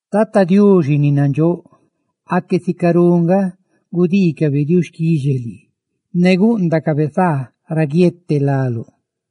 Tata Diuxi ni nandxóꞌ, ¡aque sicarú nga gudiicabe diuxquixe lii ne gúꞌndacabe saa ra guiete láluꞌ!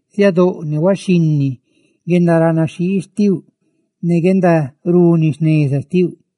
Siadóꞌ ne huaxhinni guzeetecabe guendaranaxhii xtiuꞌ ne guendaruni jneza xtiuꞌ,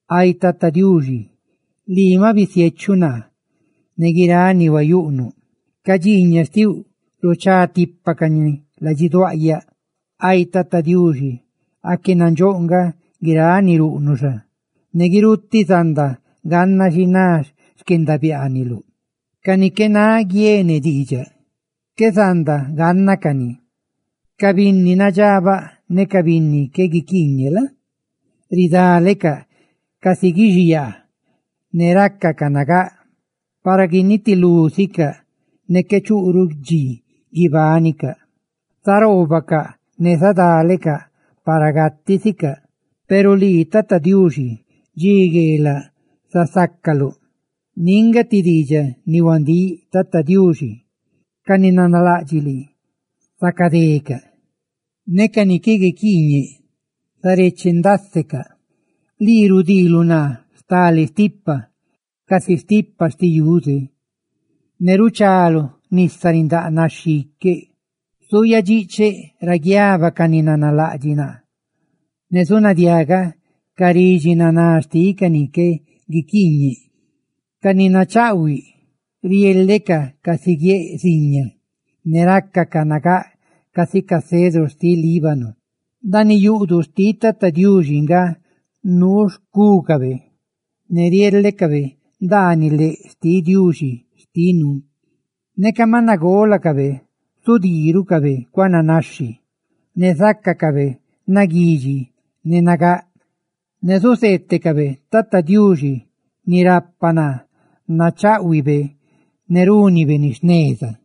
Ay Tata Diuxi, ¡lii maꞌ bisiechuꞌ naa ne guiráꞌ ni huayuꞌnuꞌ! ¡Ca dxiiñaꞌ xtiuꞌ ruchá tipa cani ladxiduáꞌ! Ay Tata Diuxi, ¡aque nandxóꞌ nga guiráꞌ ni ruꞌnuꞌ xa!, ¡ne guirutiꞌ zanda ganna xi ná xquendabiaaniluꞌ! ¡Ca ni qué náꞌ guiene diidxaꞌ qué zanda ganna cani! Ca binni nadxabaꞌ ne ca binni qué guiquiiñeꞌ la? riniisicaꞌ casi guixiyaa, ne ridalecaꞌ, para guinitilú sicaꞌ ne qué chuꞌruꞌ dxi guibánicaꞌ, zaroobacaꞌ ne zadálecaꞌ para gatiꞌ sicaꞌ. Peru lii, Tata Diuxi, dxi gueelaꞌ zasácaluꞌ. Ndiꞌ nga ti diidxaꞌ ni huandíꞌ, Tata Diuxi: ca ni nanalaꞌdxiꞌ lii, zacadecaꞌ; ne ca ni qué guiquiiñe, zarechendásecaꞌ. Lii rudiiluꞌ naa stale stipa casi stipa xtiꞌ ti yuze, ne ruchaluꞌ nisa rindáꞌ naxhi iqueꞌ. Zuyadxiꞌcheꞌ ra guiaba ca ni nanalaꞌdxiꞌ naa; ¡ne zunadiagaꞌ ca ridxi naná xtiꞌ ca ni qué guiquiiñeꞌ! Ca ni nachaꞌhuiꞌ riélecaꞌ casi guiéꞌ ziña, ne rácacaꞌ nagáꞌ casi ca cedru xtiꞌ Líbano. Ndaaniꞌ yuꞌduꞌ xtiꞌ Tata Diuxi nga nuu xcúcabe; ne riélecabe ndaaniꞌ léꞌ xtiꞌ Diuxi xtinu. Neca maꞌ nagólacabe, zudii rucabe cuananaxhi; ne zácacabe naguidxi ne nagáꞌ, ne zuzeetecabe Tata Diuxi, ni rapa naa, nacháꞌhuibe ne rúnibe ni jneza.